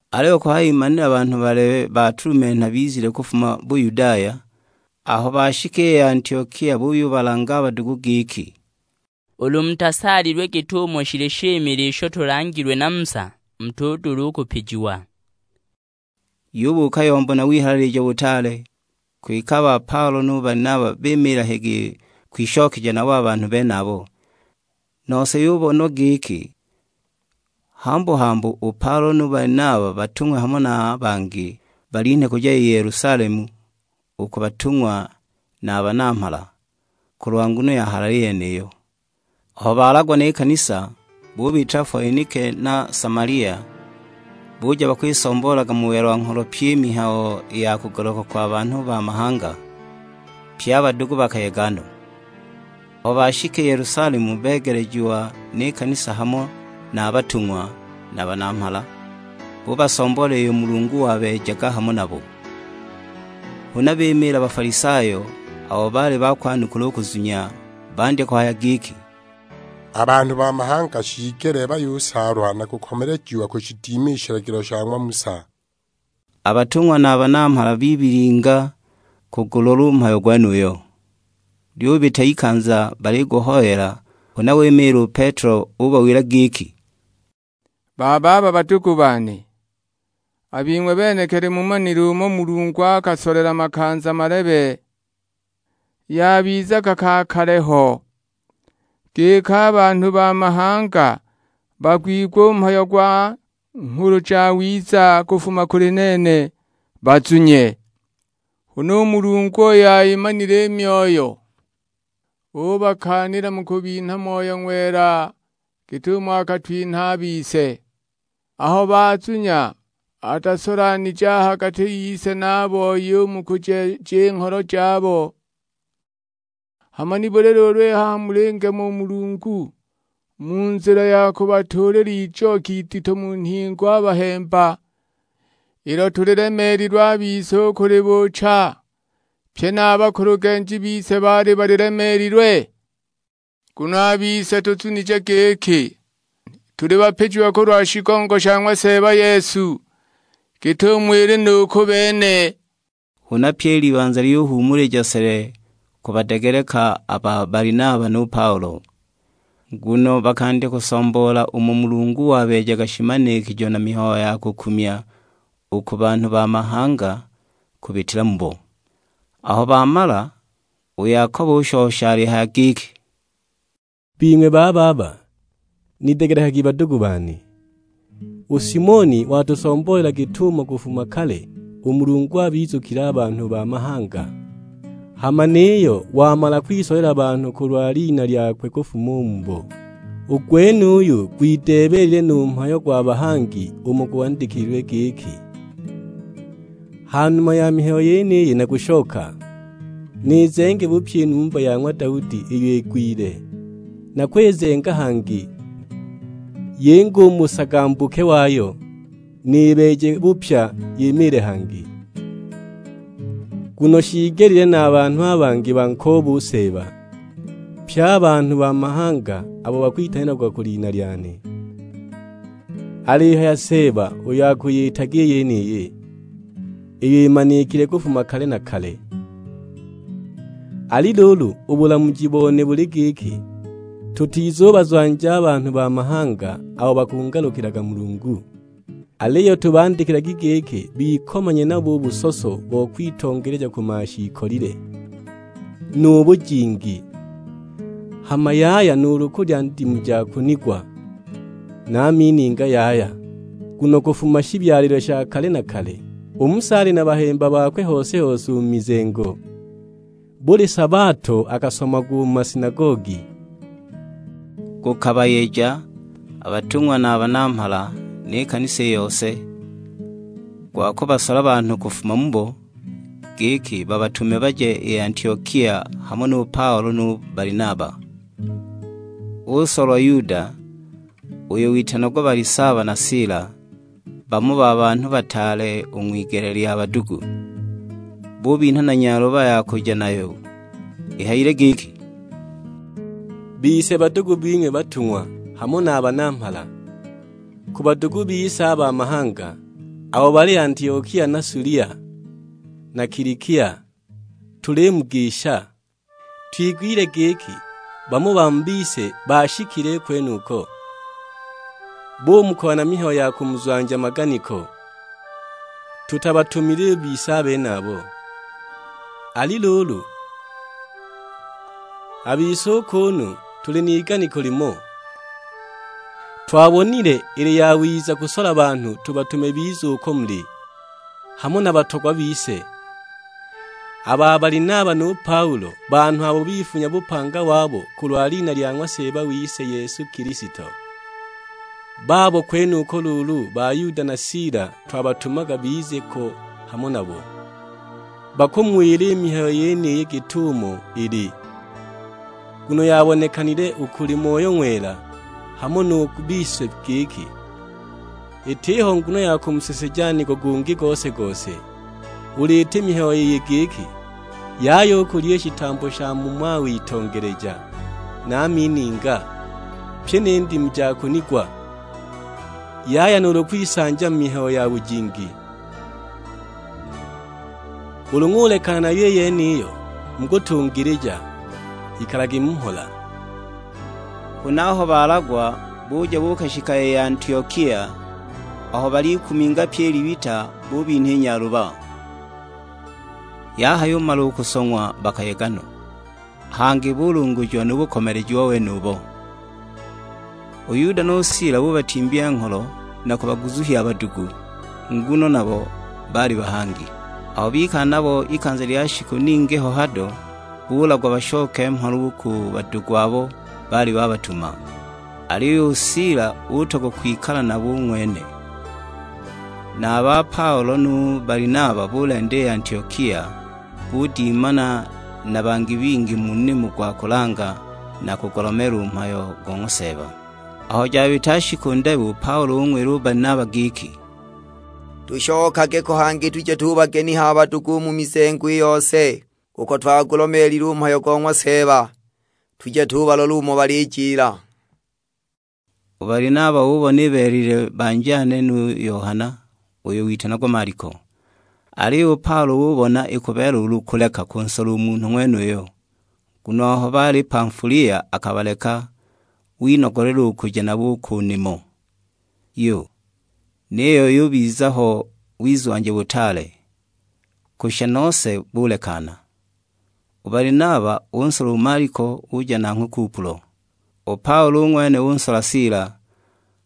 Aliyo kuhayimanila banhu balebe batulumenha bizile kufuma Buyudaya, aho bashika i Antiokia buyubalanga a badugu giki, "Ulu mutasaalilwe git'umo shili shimile isho tulangilwe na Musa, mutudula u kupijiwa!" Yubuuka yombo na wihalalija butaale, kwike a ba Paulo nu Balinaba bimiila higiyi kwishokeja nabo a banhu benabo; nose yubonwa giki hambu-hambu u Paulo nu Balinaba batung'we hamo na bangi, balinhe kuja i Yelusalemu u ku batung'wa na a banamhala, kulwa nguno ya halali yeniyo. Aho balagwa ni kanisa, bubitila Foenike na Samalia, buja bakwisomboolaga mu welwa-ngholo pyi i mihayo ya kugaluka kwa banhu ba mahanga; pye a badugu bakayega no. Aho bashika i Yelusalemu, begelejiwa ni kanisa hamo na a batung'wa, na a banamhala; bubasomboolela iyo Mulungu wabeejaga hamo nabo. Huna bimiila Bafalisayo, abo baali bakwanukula u kuzunya; bandya kuhaya giki, "A banhu ba mahanga shiigelile bayusaalwa na kukomelejiwa kushidima i shilagilo sha ng'wa Musa!" A batung'wa na a banamhala bibilinga kugulola u mhayo gwenuyo. Lyubita ikanza baliguhoyela, huna wimiila u Petelo ubawila giki, "Bababa badugu bane, a bing'we benekili mumanile umo Mulungu akasolela makanza malebe; yabizaga ka kale ho, giki a banhu ba mahanga bagwigwe u mhayo gwa Nghulu Jawiza kufuma kuli nene, bazunye. Huna u Mulungu uyo ayimanile i myoyo, ubakaanila mu kubinha Moyo Ng'wela git'umo akatwinhila a bise. Aho bazunya atasolanije a ha gati yise na a boi u mu kujeeja i ngholo jabo. Hama nibuli luulu i haha mulingema u Mulungu, mu nzila ya kubatuulila ijoki idito mu nhingo a bahemba, ilo tulilemeelilwe a bise u kulibuucha, pye na a bakulugenji bise baali balilemeelilwe? Nguno a bise tuzunije giki, tuli bapijiwa kulwa shigongo sha ng'wa Seeba Yesu, git'umo ili nu ku bene." Huna pyi i libanza lyuhuumulija sele kubadegeleka a ba Balinaba nu Paulo; nguno bakandya kusomboola umo Mulungu wabeejaga shimanikijo na mihayo ya kukumya u ku banhu ba mahanga kubitila mubo. Aho bamala, u Yakobo ushosha alihaya giki, "Bing'we bababa, nidegelekagi badugu bane. U Simioni watusomboolela git'umo kufuma kale u Mulungu abizukilile a banhu ba mahanga, hama niyo wamala kwisolela banhu kulwa lina lyakwe kufuma u mubo. U gwenuyu gwideebelile nu mhayo gwa bahangi umo gwandikililwe; giki, 'Ha numa ya mihayo yeniyi nakushoka, nizenge bupya i numba ya ng'wa Daudi iyo igwile, nakwizenga hangi, yinge u mu busagambuke wayo, nibeeje bupya yimiile hangi. Nguno shiigelile na a banhu a bangi bankoobe u Seeba, pye a banhu ba mahanga abo bakwitanilagwa ku lina lyane; alihaya Seeba uyo akuyitaga i yeniyi, iyo imanikile kufuma kale na kale.' "Ali luulu, u bulamuji bone buli giki, tutizubazwanja a banhu ba mahanga abo bakungalukilaga Mulungu. Aliyo tubandikilagi giki bikomanye nabo u busoso bo kwitongeleja ku mashiikolile, nu bujingi; hama yaya nuulu kulya ndimu ja kunigwa, na a mininga yaya. Nguno kufuma shibyalilwe sha kale na kale, u Musa ali na bahemba bakwe hose-hose u mu mizengo; buli sabato akasomagwa u mu masinagogi." Gukabayeja a batung'wa na a banamhala, ni kanisa i yose, gwa kubasola banhu kufuma mubo, giki babatume baje i Antiokia hamo nu Paulo nu Balinaba. Usolwa Yuda, uyo witanagwa Balisaba na Sila, bamo ba banhu bataale u ng'wigele lya badugu. Bubinha na nyaluba ya kuja nayo; ihayile giki, "Bise badugu bing'we batung'wa, hamo na banamhala: Ku badugu bise a ba mahanga, abo bali Antiokia na Sulia, na Kilikia. Tulimugisha. Twigwile giki bamo ba mu bise baashikile kwenuko, bumukoya na mihayo ya kumuzwanja maganiko; tutabatumile bise a benabo! Ali luulu, a bise u kuunu tuli n'iganiko limo, twabonile ili yawiza kusola banhu tubatume bize uko muli, hamo na a batogwa bise, a ba Balinaba nu Paulo; banhu abo bifunya bupanga wabo kulwa lina lya ng'wa Seeba wise Yesu Kilisto. Babo kwenuko luulu ba Yuda na Sila, twabatumaga bize ko hamo nabo; bakumuwila i mihayo yeniyi git'umo ili. Nguno yabonekanile u kuli Moyo Ng'wela hamo nu ku bise giki, itiho nguno ya kumuseseja nigo gungi gose-gose, ulu iti mihayo iyi giki: Yaya u kulya i shitambo sha mu mawitongeleja, na a mininga, pyi ni ndimu ja kunigwa; yaya nuulu kwisanja mu mihayo ya bujingi. Ulu ng'ulekana nayo i yeniyo, mukutungilija. Ikalagi mu mhola." Huna aho balagwa, buja buukashika i Antiokia; aho balikuminga pyi i libita, bubinha i nyaluba. Yahayumala u kusong'wa bakayega no, hangi bulungujiwa nu bukomelejiwa wenubo. U Yuda nu Sila bubatimbya ngholo na kubaguzuhya a badugu; nguno nabo baali bahangi. Aho bikala nabo ikanza lya shiku ningi ho hado, bulagwa bashoke mhola u ku badugu abo baali babatuma. [ Aliyo u Sila utogwa kwikala nabo u ng'wene.] Na a ba Paulo nu Balinaba bulenda i Antiokia, budimana na bangi bingi mu nimo gwa kulanga na kugulomeela u mhayo go ng'wa Seeba. Aho jabita shiku ndebe u Paulo ung'wila u Balinaba giki, "Tushokage ko hangi tuje tubageniha a badugu u mu mizengo i yose, uko twagulomeelile u mhayo go ng'wa Seeba; tuje tubalola umo balijila." U Balinaba ubona ibeelelile banjane nu Yohana, uyo witanagwa Maliko. Aliyo u Paulo ubona ikubeelela ulu kuleka kunsola u munhu ng'wenuyo, nguno aho bali Pamfulia akabaleka, winogolelwa u kuja nabo u ku nimo. Yu, niyo bubiza ho wizwanja butaale; kushisha nose bulekana. U Balinaba unsola u Maliko uja nanghwe Kupulo. U Paulo u ng'wene unsola Sila;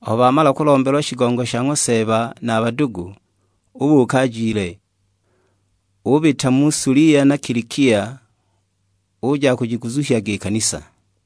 aho bamala kulombelwa shigongo sha ng'wa Seeba na a badugu, ubuuka ajile. Ubita mu Sulia na Kilikia, uja akujiguzuhyaga i kanisa.